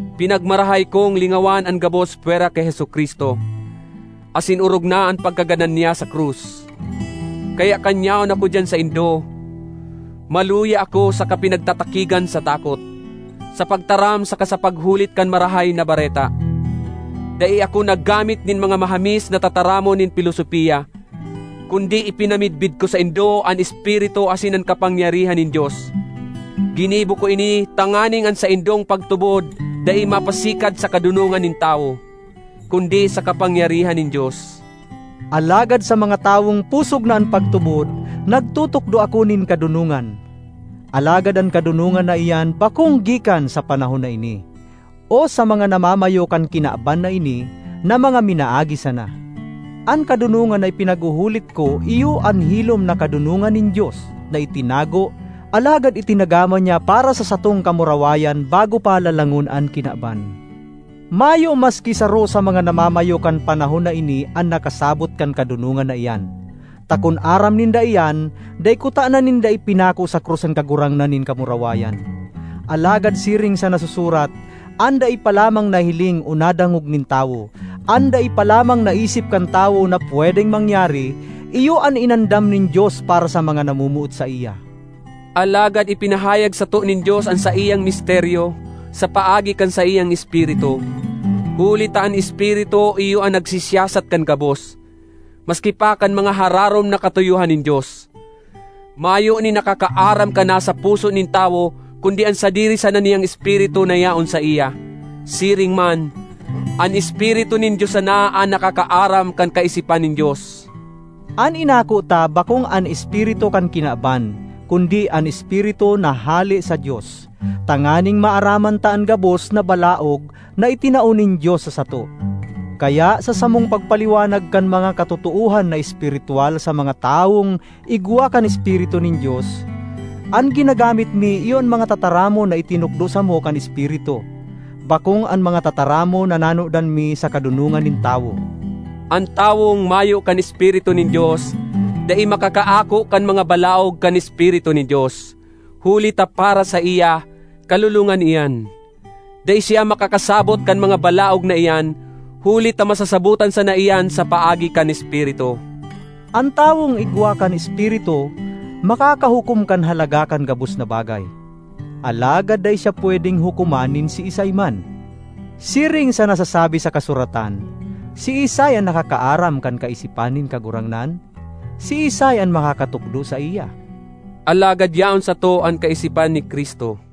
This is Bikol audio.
Pinagmarahay kong lingawan an gabos pwera ki Jesu-Cristo, asin orog na an pagkagadan niya sa krus. Kaya kan yaon ako diyan saindo, maluya ako saka pinagtatakigan sa takot. Sa pagtaram saka sa paghulit kan Marahay na Bareta, dai ako naggamit nin mga mahamis na tataramon nin pilosopia, kundi ipinamidbid ko saindo an Espiritu asin an kapangyarihan nin Dios. Ginibo ko ini tanganing an saindong pagtubod dai mapasikad sa kadonongan nin tawo, kundi sa kapangyarihan nin Dios. Alagad sa mga tawong pusog na an pagtubod, nagtutukdo ako nin kadonongan. Alagad an kadonongan na iyan bakong gikan sa panahon na ini, o sa mga namamayo kan kinaban na ini, na mga minaagi sana. An kadonongan na ipinaghuhulit ko iyo an hilom na kadonongan nin Dios na itinago alagad itinagama niya para sa satong kamurawayan bago pa lalangon an kinaban. Mayo maski saro sa mga namamayo kan panahon na ini an nakasabot kan kadonongan na iyan; ta kun aram ninda iyan, dai kutana ninda ipinako sa krus an Kagurangnan nin kamurawayan. Alagad siring sa nasusurat, “An dai pa lamang nahiling o nadangog nin tawo, an dai pa lamang naisip kan tawo na pwedeng mangyari, iyo an inandam nin Dios para sa mga namomoot saiya.” Alagad ipinahayag sato nin Dios an saiyang misteryo sa paagi kan saiyang Espiritu, huli ta an Espiritu iyo an nagsisiyasat kan gabos, maski pa kan mga hararom na katuyohan nin Dios. Mayo nin nakakaaram kan nasa puso nin tawo kundi an sadiri sana niyang espiritu na yaon saiya. Siring man, an Espiritu nin Dios sana an nakakaaram kan kaisipan nin Dios. An inako ta bakong an espiritu kan kinaban, kundi an Espiritu na hale sa Dios, tanganing maaraman ta an gabos na balaog na itinao nin Dios sa sato. Kaya sa samong pagpaliwanag kan mga katotoohan na espiritwal sa mga tawong igwa kan Espiritu nin Dios, an ginagamit mi iyo an mga tataramon na itinukdo samo kan Espiritu, bakong an mga tataramon na nanodan mi sa kadonongan nin tawo. An tawong mayo kan Espiritu nin Dios dai makakaako kan mga balaog kan Espiritu nin Dios, huli ta para saiya, kalolongan iyan. Dai siya makakasabot kan mga balaog na iyan, huli ta masasabotan sana iyan sa paagi kan Espiritu. An tawong igwa kan Espiritu makakahukom kan halaga kan gabos na bagay; alagad dai siya pwedeng hukoman nin siisay man. Siring sa nasasabi sa kasuratan, “Siisay an nakakaaram kan kaisipan nin Kagurangnan? Siisay an makakatukdo saiya?” Alagad yaon sato an kaisipan ni Cristo.